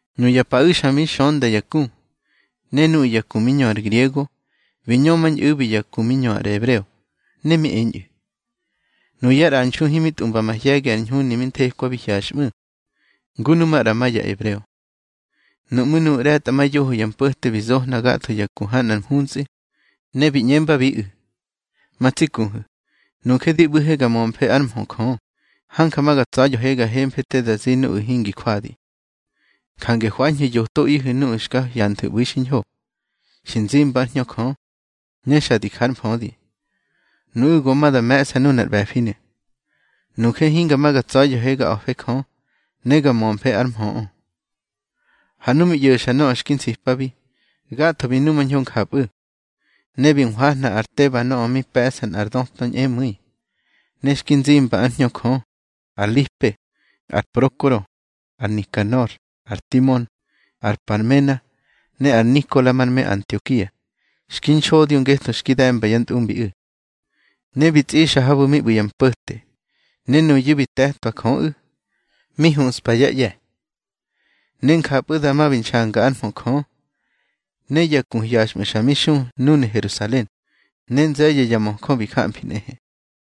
Nuya paꞌu̱ xa mi xönda ya ku. Ne nuꞌu̱ ya ku mi ñö ar griego bi ñömañꞌu̱bi ya ku mi ñö ar ebreo. Ne mi eñꞌu̱, nuyá ꞌranxu himi tꞌumba mahye̱gi ar ñhuni mi thekwabi hyaxꞌmu̱, ngu nu maꞌra ma ya ebreo. Nuꞌmú̱ nuꞌu̱ ꞌre̱tꞌamayoho ya mpo̱te bi zohna gatho ya ku ha nꞌar mhuntsꞌi, ne bi ꞌñembabiꞌu̱: —Ma tsi kuhu̱, nuje di ꞌbu̱he ga mömfe ár mhö Jö, hanja ma ga tsa̱ya̱he ga hemfe te da zi nuꞌu̱ hingi jwadi. Jange hwañhu̱ yotoꞌihu̱ nuꞌu̱ xka hyanthu̱ ꞌbu̱i xiñho, xi nzimba ár Hñö Jö, ne xa di ja ár mfödi. Nuꞌu̱ go ma da me̱ꞌsa nuna ar ꞌbe̱finu̱. Nuje hinga ma ga tsa̱ya̱he ga a̱fe Jö, ne ga mömfe ár mhöꞌö. Ha nu mi ꞌyo̱xa nöꞌö xki nsipabi, gatho bi numañho njapꞌu̱. Ne bi nhwahna ar Teba nöꞌö mi pe̱ꞌsa nꞌar döta ñꞌemu̱i, ne xki nzimba ár Hñö Jö, ar Lipe, ar Prokoro, ar Nikanor, ar Timon, ar Parmena, ne ar Nikola mar me Antiokia, xki nxodyo ngetho xki de̱mba yá ntꞌumbiꞌu̱. Ne bi tsꞌixa habu̱ mi ꞌbu̱ ya mpo̱te, ne nuyu̱ bi te̱tꞌwa Jöꞌu̱, mi huspa yá ꞌye̱. Ne njapꞌu̱ dama mi nxanga ár mhö Jö, ne ya ku hyaxꞌmu̱ xa mi xu núnu̱ Herusalen, ne nze̱ye̱ ya möjö bi gamfi nꞌehe.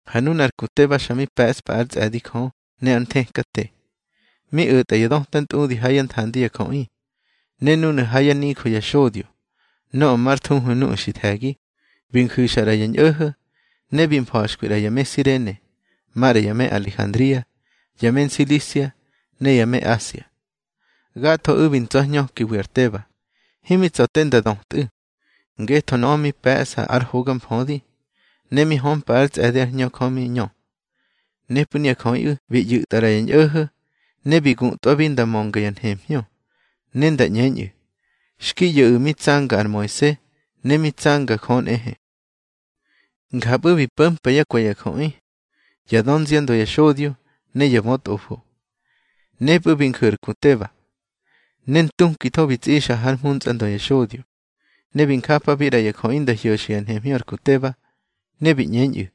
Ha nu ar ku Teba xa mi pe̱ꞌspa ár tsꞌe̱di Jö ne ár nthekate. Mi o̱tꞌa ya döta ntꞌudi ha yá nthandi ya jöꞌi. Ne núnu̱ ha yá nijö ya xodyo, nöꞌö mar thuhu Nuꞌu̱ xi The̱gi, bi nju̱xa ꞌra ya ñꞌo̱ho̱, ne bi mfa̱xkwi ꞌra ya me Sirene, maꞌra ya me Alejandria, ya me Nsilisia, ne ya me Asia. Gathoꞌu̱ bi ntsa̱hñökiwi ar Teba. Himi tsa̱ te nda dötꞌu̱, ngetho nöꞌö mi pe̱ꞌsa ar hoga mfödi, ne mi hömpa ár tsꞌe̱di ár Hñö Jö mi ñö. Nepꞌu̱ nuya jöꞌiꞌu̱ bi ꞌyu̱tꞌa ꞌra ya ñꞌo̱ho̱, ne bi guꞌtwabi nda mönga ya nhemhñö, ne nda ꞌñeñꞌu̱, xki ꞌyo̱ꞌu̱ mi tsanga ar Moise, ne mi tsanga Jö nꞌehe. Njapꞌu̱ bi po̱mpa yá kwe̱ ya jöꞌi, yá dönziandö ya xodyo, ne ya bötꞌofo. Nepꞌu̱ bi nju̱ ar ku Teba, ne ntukitho bi tsꞌixa hár mhuntsꞌa ndö ya xodyo. Ne bi njapabi ꞌra ya jöꞌi nda hyo̱xa ya nhemhñö ar ku Teba, ne bi ꞌñeñꞌu̱: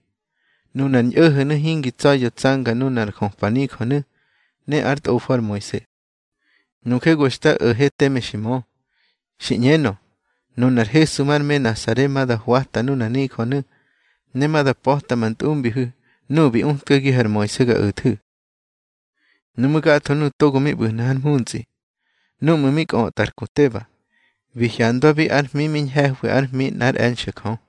—Nuna ar ñꞌo̱ho̱nu̱ hingi tsa̱ya̱ tsanga nuna ar jöpa nijönu̱ ne ár tꞌofo ar Moise. Nuje go xta o̱he teme xi mö, xi ꞌñenö, nunar Hesu mar me Nasare ma da hwata nunar nijönu̱, ne ma da pa̱ta ma ntꞌumbihu̱ nuꞌu̱ bi utkagihu̱ ar Moise ga o̱thu̱. Nuꞌmú̱ gatho nuꞌu̱ togo mi ꞌbu̱hnu̱ har mhuntsꞌi, núꞌmu̱ mi kꞌötꞌa ar ku Teba, bi hyandwabi ár hmi mi ñhe̱hwi ár hmi nꞌár e̱nxe̱ Jö.